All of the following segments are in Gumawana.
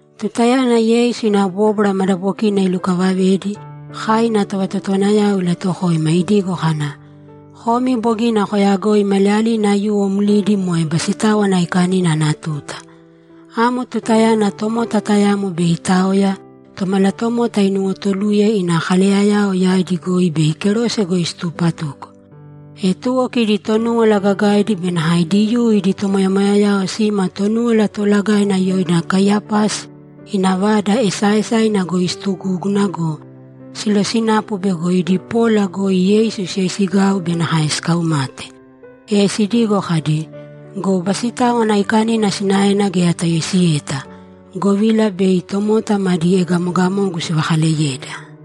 Tutayana Yeisu ina bóbwara madabokina ilukavavedi, kai ina tovatotowanayao ilatuwokoima idigo kana, ‘Komi bogina koyagoi maliyalina aiyuwo mlidi moe Basitáwana Aikanina ana tuta. Amo tutayana tomota tayamo bei itaoya, Tomalatomota inuwotuluye ina kaleyayao yaidi goi bei kerose goi situpatuko.’ E tuwo kidi Tonúwala Gagaidi be nakae Diyuu idi tomoyamoyayao sima Tonúwala Toolagaina yoina Kaiyapasi ina vada esaaesaina goi situgúguna go, silosinapu bego idi pola goi Yeisu siyoisigau be nakae sikaumate. E sidigo kadi, ‘Go Basitáwana Aikanina sinaena geya tayoisiyeta, govila bei tomota madi egamogamogu sivakaleyeda.’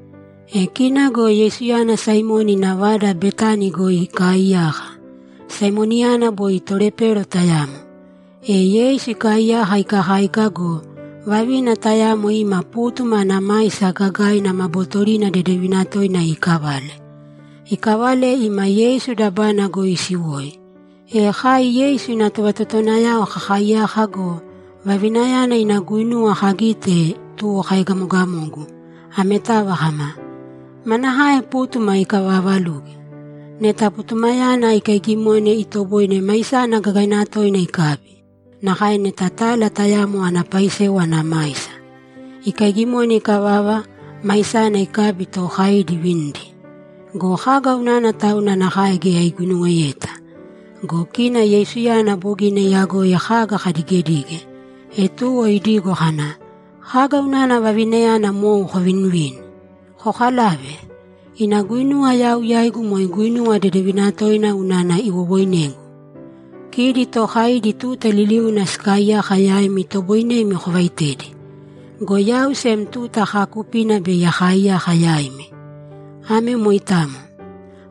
E kina go Yeisuyana Saimoni ina vada Betani goi ikaaiyaka. Saimoniyana boi tolepero tayamo. E Yeisu ikaaiyaka ikakáika go, vavina tayamo ima pútuma ana maisa gagaina ma bootorina dedevina toina iikavale. Ikavale ima Yeisu dabana goi isiwoi. E kai Yeisu ina tovatotowanayao kakaaiyaka go, vavinayana ina guinuwa kagite, tuwo kaegamogamogu, ametava kama, ‘Manakae pútuma ikavaavaluge! Neta putumayana ikaigimone, itoboine maisana gagaina toina ikabi; nakae neta tala tayamo ana paisewa ana maisa. Ikaigimone ikavava, maisana ikabi, tookaidi ivinidi! Go kaga unana tauna nakae geya iguinuweyeta?’ Go kina Yeisuyana bogina iyagoi kaga kadigedige, e tuwo idigo kana, ‘Kaga unana vavinayana mou kovinivini? Kokalāve. Ina guinuwa yau yaigu moe guinuwa dedevina toina unana iwowoinegu. Kidi tookaidi tuta liliuna sikaaiyaka yaimi itoboinemi kovaitedi. Go yau sem tuta kaakupina bei akaaiyaka yaimi. Ame moitamo.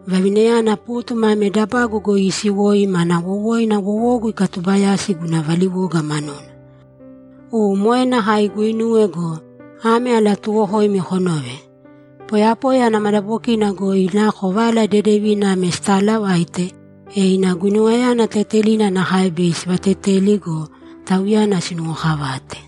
Vavinayana pútuma ame dabagu goi iisiwoi mana wowoina wowogu ikatubayasi guna valiwoga manuna. U, moe nakae iguinuwe go, ame alatuuwokoimi konōve: Poyapoya ana madabokina goi nako Vala Dedevina ame sitaalavaite, e ina guinuwayana tetelina nakae bei sivateteli go, tauyana sinuwokavate.’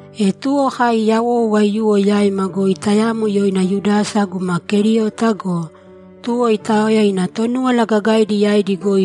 E tuwo kai yawou aiyuwo yaima goi tayamo yoina Yudasa guma Keriota go, tuwo itaoya ina Tonúwala Gagaidi yaidi goi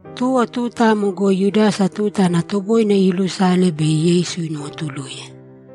Tuwo tuta amo goi Yudasa tuta ana toboine iilusale bei Yeisu inuwotuluye.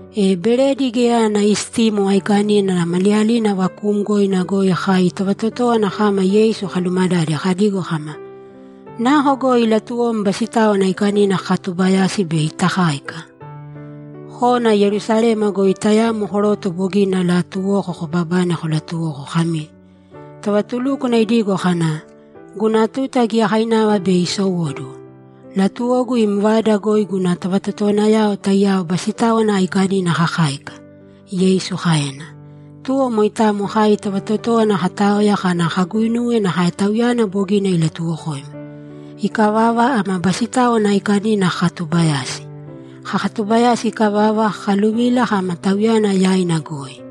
E Beredi Geya Ana Istimo Aikanina ana maliyalina vakuumgoina goi kai tovatotówana kama Yeisu kalumadade kadigo kama, ‘Nako goi latuwom Basitáwana Aikanina kakatubayasi bei takáika?’ ‘Kōna Yerusalema goi tayamo koroto bogina alaatuwoko kobabane kolatuwōko kami, “Tovatulúkwana idigo kana, ‘Guna tuta giyakainava bei isowóduwo. Latuwogu im vada goi guna tovatotowanayao taiyao Basitáwana Aikanina kakáika’”’, Yeisu kaena. Tuwo moitamo kai tovatotówana kataoya kana kaguinuwe nakae Tauyana bogina ilatuwokoima. Ikavava, ama Basitáwana Aikanina kakatubayasi. Kakatubayasi ikavava, kakaluvila kama Tauyana yaina goi.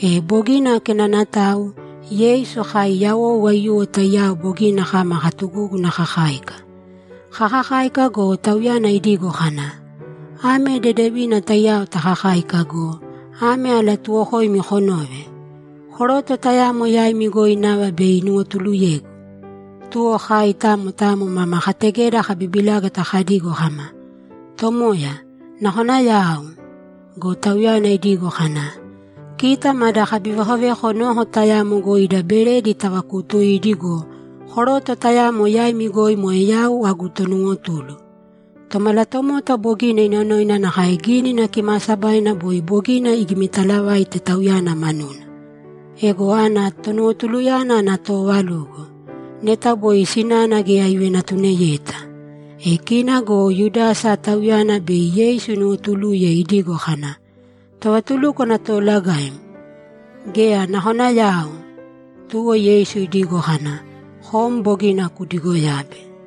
E bogina kenanatau, Yeisu kai yawou aiyuwo taiyao bogina kama katugúguna kakáika. Kakakáika go, Tauyana idigo kana, ‘Ame dedevina taiyao takakáika go, ame alatuuwokoimi konōve: Koroto tayamo yaimi goi nava bei inuwotuluyegu.’ Tuwo kai tamo tamo mama kategeda kabibilágata kadigo kama, ‘Tomoya, nakona yau?’ Go Tauyana idigo kana, ‘Kita mada kabivekoveko noko tayamo goi ida beredi tavakuutuidi go, koroto tayamo yaimi goi moe yau agu tonuwotulu. Tomalatomota bogina inonoina nakae Gínina Kimaasabaina boi bogina igimitalavaite Tauyana manuna. Ego ana tonuwotuluyana ana toovalugo! Neta boi sinana geya ivenatuniyeta!’ E kina go Yudasa, tauyana bei Yeisu inuwotuluye, idigo kana, ‘Tovatulúkwana Toolagaim, geya, nakona yau?’ Tuwo Yeisu idigo kana, ‘Kom bogina kudigoyabe.’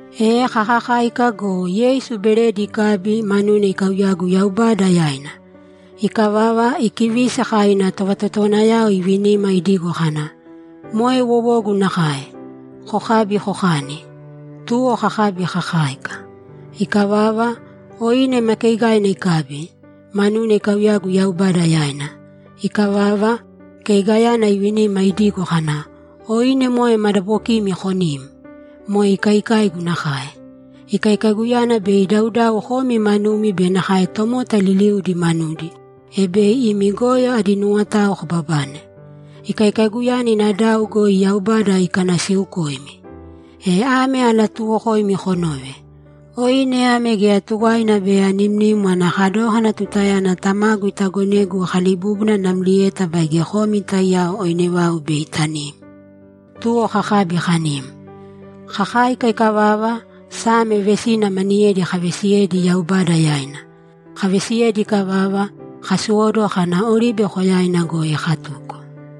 E kakakáika go, Yeisu beredi ikabi, manuna ikauyagu Yaubada yaina. Ikavava, ikivisi, kai ina tovatotowanayao ivinima idigo kana, ‘Moe wowogu nakae. Kokābi kokāni.’ Tuwo kakabi kakáika. Ikavava, oine ma keeigaina ikabi, manuna ikauyagu Yaubada yaina. Ikavava, keigayana ivinima idigo kana, ‘Oine moe madabokimi konīm. Moe ikaikaigu nakae. Ikaikaiguyana bei idaudau komi manumi be nakae tomota liliudi manudi, e bei imi goyo adi nuwotao kobabane. Ikaikaiguyana ina dau goi Yaubada ikanasiukoimi. E ame alatuuwokoimi konōve: Oine ame geya tuwaina bei animnim ana kadókana tutayana Tamagu itagonegu akalibúbuna namlieta baige komi taiyao oine vau bei tanim.’ Tuwo kakabi kanim. Kakáika ikavava, Same vesina maniyedi kavesiyedi Yaubada yaina. Kavesi ikavava, kasowóduwo kana Oribe Koyaina goi katuko.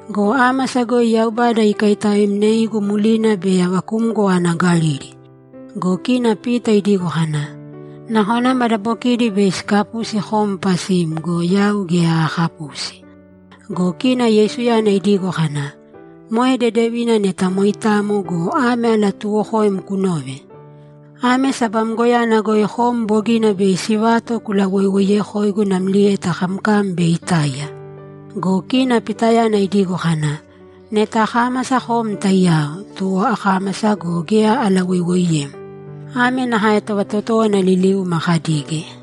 Go ámasa goi Yaubada ikaitaoemneigu mlina bei avakumgo ana Galili.’ Go kina Pita idigo kana, ‘Nakona madabokidi bei sikapusi kom pasim go, yau geya aakapusi.’ Go kina Yeisuyana idigo kana, ‘Moe dedevina neta moitamo go, ame alatuuwokoim kunōve: Ame sabamgoyana goi kom bogina bei sivato kulawoiwoiyekoigu namlieta kamkam bei itáiya!’ Go kina Pitayana idigo kana, ‘Neta akámasa kom taiyao, tuwo akámasa go, geya alawoiwooiyem.’ Ame nakae tovatotówana liliuma kadige.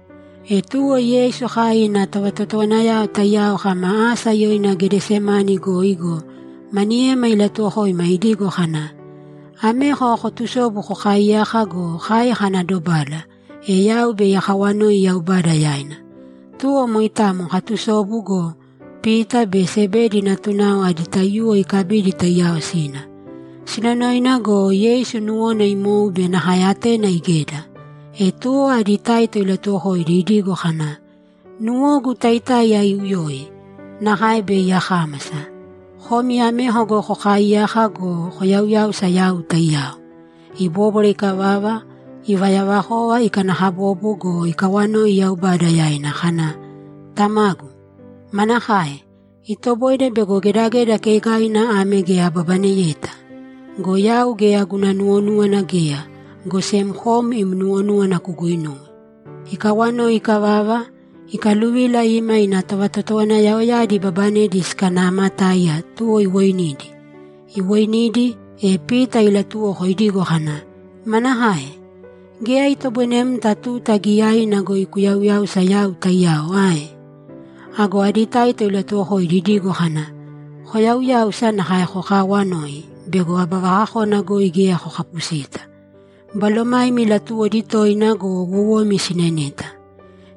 E tuwo Yeisu kai ina tovatotowanayao taiyao kama asa yoina Gedesemane goi go, maniyema ilatuwokoima, idigo kana, ‘Ameko kotusōbu kokaaiyāka go, kai kana dobala, e yau bei akawanoi Yaubada yaina.’ Tuwo moitamo katusobu go, Pita be Sebedi natunao adi taiyuwo ikabidi taiyao sina. Sinonoina go, Yeisu nuwona imou be nakae atena igeda. E tuwo adi taito ilatuwokoidi idigo kana, ‘Nuwogu taitáiya iuyoi, nakae bei akámasa. Komi ameko goi kokaaiyāka go, koyauyāusa yau taiyao.’ Ibóbwara ikavava, ivayavakova ikanakabobo go, ikawanoi Yaubada yaina kana, ‘Tamagu, manakae? Itoboine bego gedageda keigaina ame geya ababaneyeta? Go yau geya guna nuwonúwana geya, go sem kom im nuwonúwana kuguinūwe.’ Ikawanoi ikavava, ikaluvila ima ina tovatotowanayaoyadi ibabanedi sikanaamatáiya, tuwo iwoinidi. Iwoinidi, e Pita ilatuwoko idigo kana, ‘Manakae? Geya itoboinemta tuta giiyaina goi kuyauyáusa yau taiyao ae?’ Ago adi taito ilatuwokoidi idigo kana, ‘Koyauyāusa nakae kokaawanōi bego aba vakakona goi geya kokapusita. Balomaimi latuwodi toina go, wowomi sineneta.’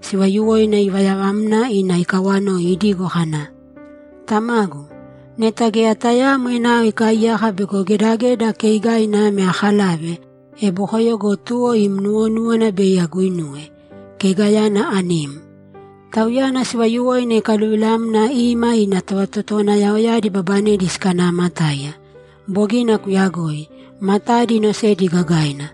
Sivayuwoina ivayavamna ina ikawanoi idigo kana, ‘Tamagu, neta geya tayaamo enao ikaiyaka bego gedageda keigaina ame akalave, e bokoyo go tuwo im nuwonúwana bei aguinuwe; keigayana anim.’ Tauyana sivayuwoina ikaluvilamna ima ina tovatotowanayaoyadi ibabanedi sikanaamatáiya. Bogina kuyagoi. Matadi inosedi gagaina.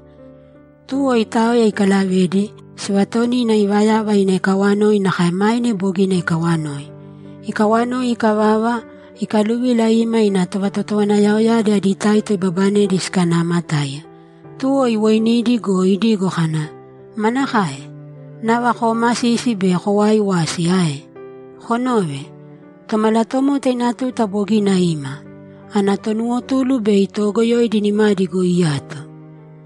Tuwo itaoya ikalavedi, sivatonina ivayava ina ikawanoi nakae maine bogina ikawanoi. Ikawanoi ikavava, ikaluvila ima ina tovatotowanayaoyadi adi taito ibabanedi sikanaamatáiya. Tuwo iwoinidi go, idigo kana, ‘Manakae? Nava koomasisi be kowaaiwasi ae? Konōve. Tomalatomota ina tuta bogina ima. Ana tonuwotulu bei toogoyoidi nimadi goi iyato.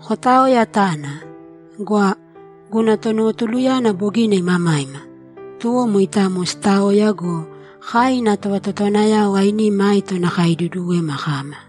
Kotāoya tāna. Gwa! Guna tonuwotuluyana bogina imamaima.’ Tuwo moitamo sitaoya go, kai ina tovatotowanayao ainima aito nakae iduduwema kama.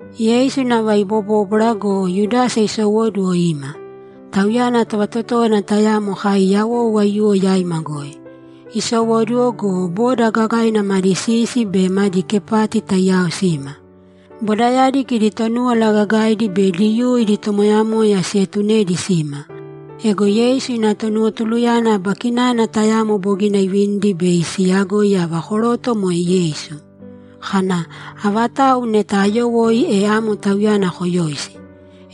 Yeisu nava ibobóbwara go, Yudasa isowóduwo ima. Tauyana tovatotówana tayamo kai yawou aiyuwo yaima goi. Isowóduwo go, boda gagaina madi sisi be madi kepati taiyao sima. Bodayadi kidi Tonúwala Gagaidi be Diyuu idi tomoyamoyayao sietunedi sima. Ego Yeisu ina tonuwotuluyana aba kinana tayamo bogina ivinidi bei siiyagoi ava koroto moe Yeisu, kana, ‘Avatau neta ayowoi, e amo Tauyana koyōisi.’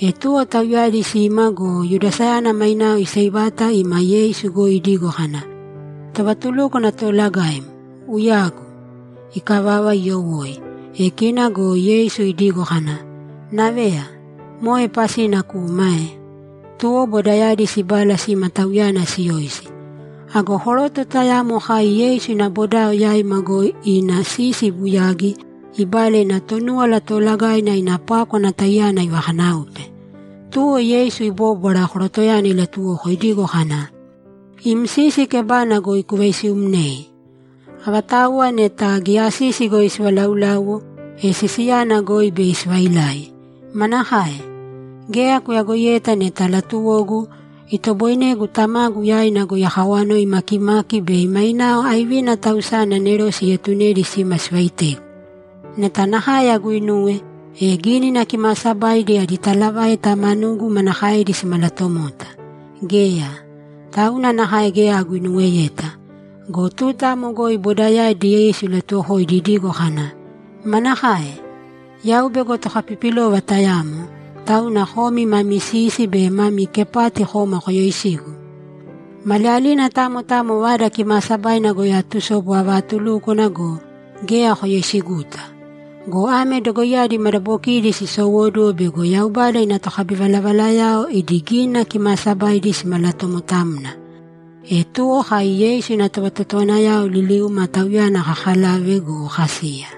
E tuwo tauyadi sima go, Yudasayana mainao iseivata ima Yeisu goi idigo kana, ‘Tovatulúkwana Toolagaim, uyagu!’ Ikavava, iyowoi. E kina go Yeisu idigo kana, ‘Naveya, moe pasina kuma ae?’ Tuwo bodayadi sibala sima Tauyana siyoisi. Ago koroto tayamo kai Yeisu ina bodao yaima goi ina sisi ibuyagi, ibala ina Tonúwala Toolagaina ina pákwana taiyana ivakanáupe. Tuwo Yeisu ibóbwara, korotoyana ilatuwoko idigo kana, ‘Im sisi kebana goi kuvaisiumnēi! Avatauwa neta giya sisi goi sivalauláuwo, e sisiyana goi bei sivailai. Manakae? Geya kuyagoiyeta neta latuwogu, itoboinegu Tamagu yaina goi akawanoi makimaki bei mainao aivina tausani anerose ietunedi sima sivaitegu? Neta nakae aguinuwe, e Gínina Kimaasabaidi adi talavaita manugu manakaedi simalatomota? Geya. Tauna nakae geya aguinuweyeta.’ Go tuta amo goi bodayadi Yeisu ilatuwokoidi idigo kana, ‘Manakae? Yau bego tokapipilova tayamo, tauna komi mami sisi be mami kepati koma koyoisigu? Maliyalina tamo tamo Vada Kimaasabaina goi atusobu avaatulúkwana go, geya koyoisiguta. Go ame dogoiyadi madabokidi sisowóduwo bego Yaubada ina tokabivalavalayao idi Gínina Kimaasabaidi simalatomotamna.’ E tuwo kai Yeisu ina tovatotowanayao liliuma Tauyana kakalave go, kasiya.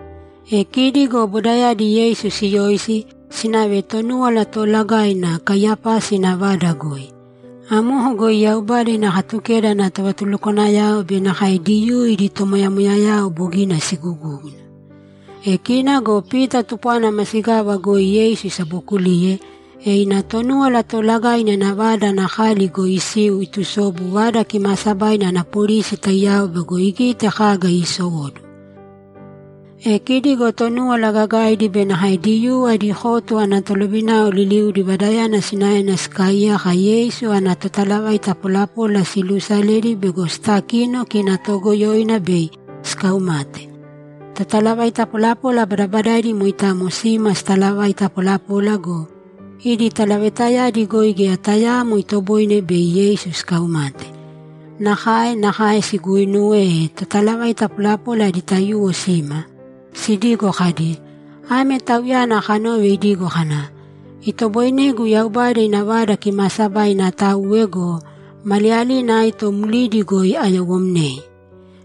E kidi go bodayadi Yeisu siyoisi, sinave Tonúwala Toolagaina Kaiyapasi ina vada goi. Amoko goi Yaubada ina Katukeda ana tovatulukwanayao be nakae Diyuu idi tomoyamoyayao bogina sigugúguna. E kina go Pita tupwana masigava goi Yeisu isabookuliye, e ina Tonúwala Tolagainayana ina vada ana kali goi isiu itusobu Vada Kimaasabaina ana polisi taiyao bego igite kaga iisowóduwo. E kidi go Tonúwala Gagaidi be nakae Diyuu adi kotu ana tolovinao liliudi vadayana sinaena sikaaiyaka Yeisu ana totalavaita polapola siluusaledi bego sitakino kina toogoyoina bei sikaumate. Totalavaita polapola badabadaidi moitamo sima sitalavaita polapola go, idi talavaitayadi goi geya tayaamo itoboine bei Yeisu sikaumate. Nakae nakae siguuinuwe, e totalavaita polapola adi taiyuwo sima sidigo kadi, ‘Ame Tauyana kanove idigo kana, “Itoboinegu Yaubada ina Vada Kimaasabaina atauwe go, maliyalina aito mlidi goi ayowomnei.”’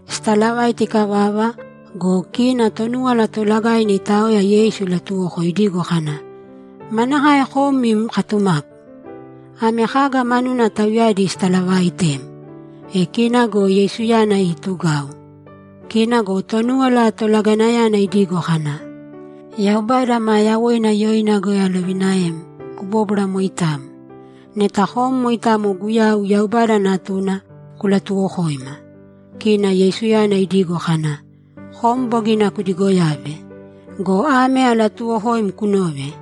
Sitalavaita ikavava go, kina Tonúwala Toolagaina itaoya Yeisu ilatuwoko idigo kana, ‘Manakae kom im katumapu? Ame kaga manuna tauyadi sitalavaaitem?’ E kina go Yeisuyana iitugau. Kina go Tonúwala Tolagainayana idigo kana, ‘Yaubada maa yawoina yoina goi alovinaem: Kubōbwara moitamo. Neta kom moitamo Guyau, Yaubada Natuna, kulatuwokōima!’ Kina Yeisuyana idigo kana, ‘Kom bogina kudigoyabe. Go ame alatuuwokoimi konōve: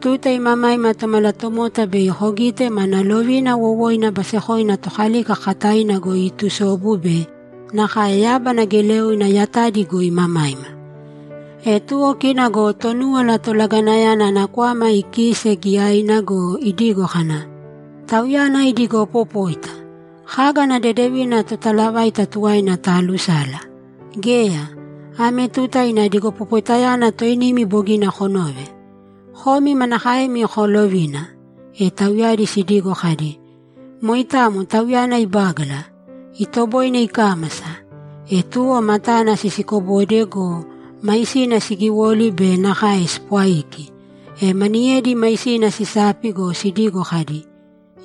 Tuta imamaima Tomalatomota bei kogite mana lovina wowoina basekoina Tokalika kakataina goi iitusobu be nakae yábana geleoina yatadi goi imamaima.’ E tuwo kina go Tonúwala Tolagainayana ana kwama ikiise giyaina go, idigo kana, ‘Tauyana idigopopóita! Kaga ana dedevina totalavaita tuwaina taalusala? Geya! Ame tuta ina digopopoitayana toinimi bogina konove! Komi manakaemi koolovina?’ E tauyadi sidigo kadi, ‘Moitamo Tauyana ibágala. Itoboine ikámasa!’ E tuwo matana sisikobode go, maisina sigiwoli be nakae sipwaiki. E maniyedi maisina sisapi go, sidigo kadi,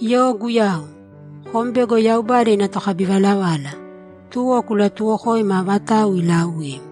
‘Yo Guyau! Kom bego Yaubada ina tokabivalavala, tuwo kulatuwokōima avatau iilauim!’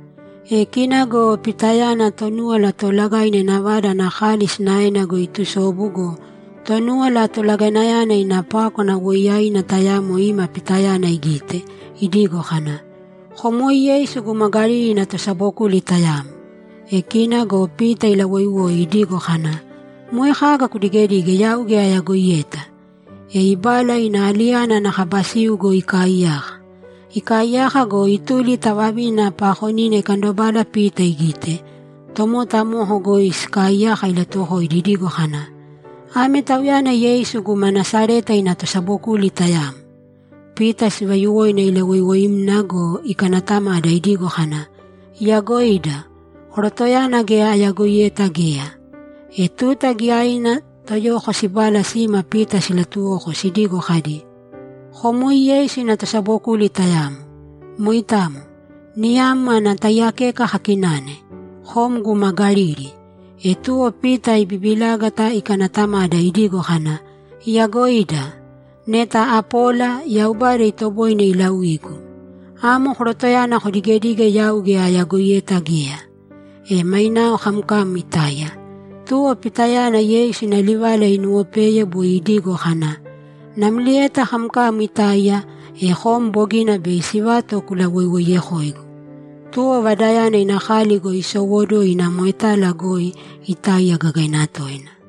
E kina go Pitayana Tonúwala Toolagaina ina vada ana kali sinaena goi iitusobu go, Tonúwala Toolagainayana ina pákwana woiyaina tayamo ima Pitayana igite, idigo kana, ‘Kom woi Yeisu guma Galili ina tosabokuli tayamo.’ E kina go Pita ilawoiwoi idigo kana, ‘Moe kaga kudigedige yau geya ayagoiyeta!’ E ibala ina aliyana ana kaba siu goi ikaaiyaka. Ikaaiyaka go, ituli ta vavina paakonina ikandobala Pita igite, tomota amoko goi sikaaiyaka ilatuwokoidi idigo kana, ‘Ame tauyana Yeisu guma Nasareta ina tosabokuli tayamo.’ Pita sivayuwoina ilawoiwoimna go, ikanatamada idigo kana, ‘Iyagoida! Korotoyana geya ayagoiyeta geya!’ E tuta giyaina toyoko sibala sima Pita silatuwoko sidigo kadi, ‘Kom woi Yeisu ina tosabokuli tayamo. Moitamo. Niyam ana taiyakeka kakinane. Kom guma Galili.’ E tuwo Pita ibibilágata ikanatamada idigo kana, ‘Iyagoida! Neta apola, Yaubada itoboine ilauigu. Amo korotoyana kodigedige yau geya ayagoiyeta geya!’ E mainao kamkam itáiya. Tuwo Pitayana Yeisu ina livala inuwopeye boi idigo kana, ‘Namlieta kamkam itáiya, e kom bogina bei sivato kulawoiwoiyekoigu.’ Tuwo vadayana ina kali goi isowóduwo ina moetala goi itáiya gagaina toina.